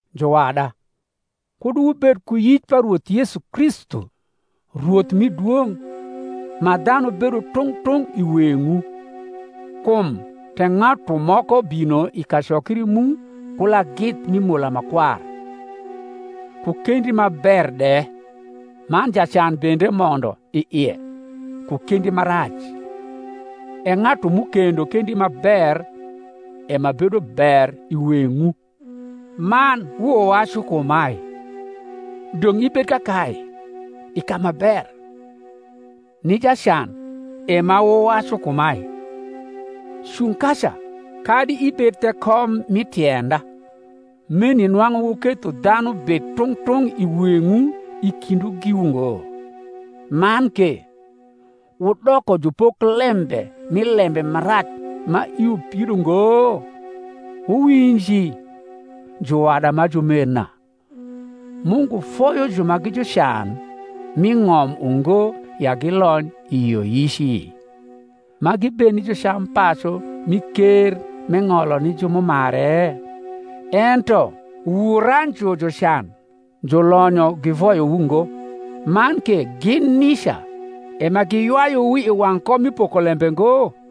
Juwada, kud wubed ku yic pa Rwoth Yesu Kristu, Rwoth rni dwong’, ma dhanu bedo tung’ tung’ i weng’wu. Kum tek ng’atu moko bino i kacokri mu ku lagith mi mola ma kwar, ku kendi ma ber de, man jacan bende mondo i ie ku kendi ma rac; e ng’atu m’ukendo kendi ma ber e ma bedo ber i weng’wu, man wuwacu kumae, Dong’ ibed kakae i ka ma ber; ni jacan e ma wuwacu kumae, Cung kaca, kadi ibed the kom mi tienda; meni nwang’u wuketho dhanu bed tung’ tung’ i weng’wu i kindwu giwu ngo, man ke wudoko jupoklembe mi lembe ma rac ma iwu pido ngo? Wuwinji, juwada ma jumerna; Mungu foyo ju ma gi jucan m’i ng’om ungo ya gilony i yioyici, ma gibed ni jucampacu mi ker m’eng’olo ni ju m’umare? Ento wuranju jucan. Julonyo givoyowu ngo, man ke gin nica e ma giywayuwu i wang’ kom mi pokolembe ngo?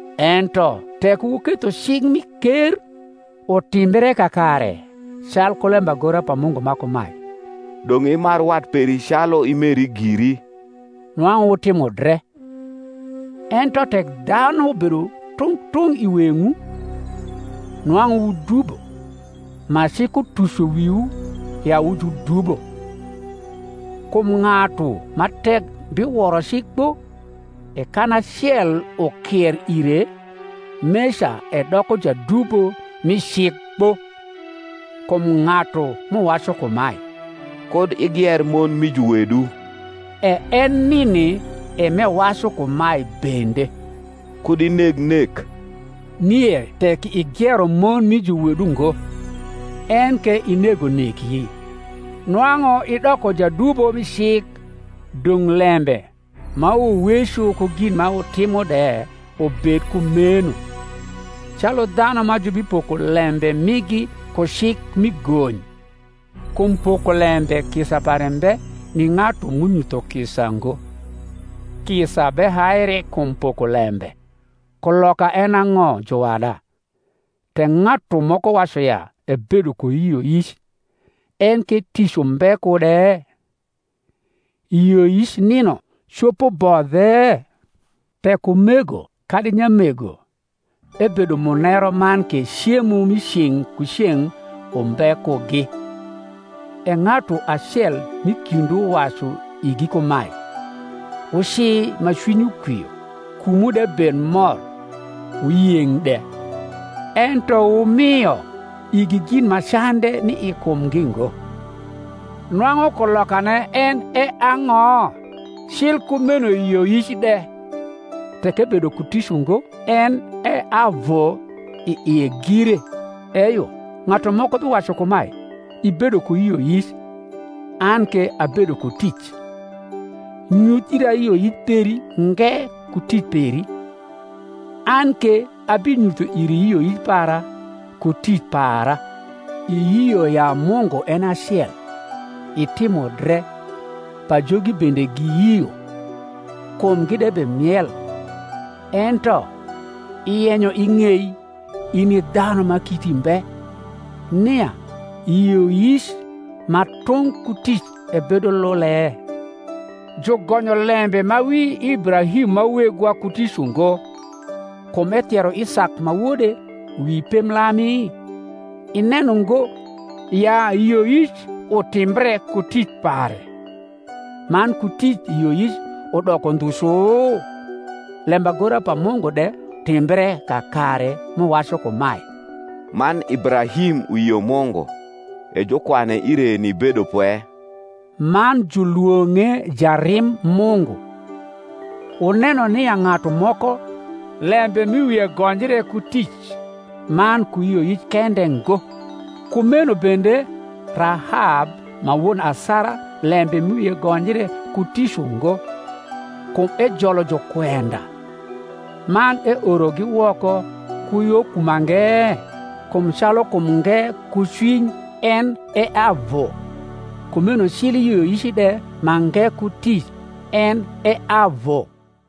Ento tek wuketho cik mi ker utimbre kakare, calku lembagora pa Mungu ma kumae, Dong’ imar wat peri calu imeri giri, nwang’u wutimo dre: ento tek dhanu bedo tung’ tung’ i weng’wu, nwang’u wudubo, ma cik utuco wiwu ya wu judubo. Kum ng’atu ma tek biworo cik kpo, e kan acel ukier ire, meca edoko jadubo mi cik kpo. Kum ng’atu m’uwacu kumae, Kud igier mon mi juwedu, e en nini e m’ewacu kumae bende, Kud ineg nek. Nie tek igiero mon mi juwedu ngo, enke inego neki, nwang’u idoko jadubo mi cik. Dong’ lembe ma wuweco ku gin ma wutimo de ubed kumeno, calu dhanu ma jubipoko lembe migi ku cik mi gony. Kum pokolembe kisa pare mbe ni ng’atu m’unyutho kisa ngo: kisa behaire kum pokolembe. Kuloka en e ang’o, juwada, tek ng’atu moko wacu ya ebedo ku yioyic, enke tic umbe kude? yioyic nino copo bodhe? Tek umego kadi nyamego ebedo muneru man ke cemo mi ceng’ ku ceng’ umbe kugi, e ng’atu acel m’i kindwu wacu igi kumae, Wuci ma cwinywu kwio, kumwu de bed mor wuyeng’ de; ento wumio igi gin ma cande ni i kumgi ngo; nwang’u kulokane en e ang’o? Cil kumeno yioyic de, tek ebedo ku tic ungo, en e avu i ie gire. Eyo, ng’atu moko biwacu kumae, Ibedo ku yioyic, an ke abedo ku tic: nyuth ira yioyic peri nge ku tic peri, an ke abinyutho iri yioyic para ku tic para. Iyio ya Mungu en e acel; itimo dre: pajogi bende giyio, kumgi de bemiel. Ento iyenyo ing’ei, in i dhanu ma kiti mbe, nia yioyic ma tung’ ku tic ebedo lule? Jugonyo lembe ma wi Ibrahim ma wegwa ku tic ungo, kum ethiero Isak ma wode wi pemblami? Ineno ngo ya yioyic utimbre ku tic pare, man ku tic yioyic udoko ndhu cu? lembagora pa Mungu de timbre kakare m’uwacu kumae, Man Ibrahim uyio Mungu, e jukwane ire ni bedopwe; man julwong’e jarim Mungu. Wuneno nia ng’atu moko lembe m’i wie gonjre ku tic, man ku yioyic kende ngo. Kumeno bende Rahab ma won asara lembe m’i wie gonjre ku tic ungo, kum ejolo jukwenda, man eorogi woko ku yo ku mange? Kum calu kum nge ku cwiny en e avu, kumeno cil yioyic de ma nge ku tic en e avu.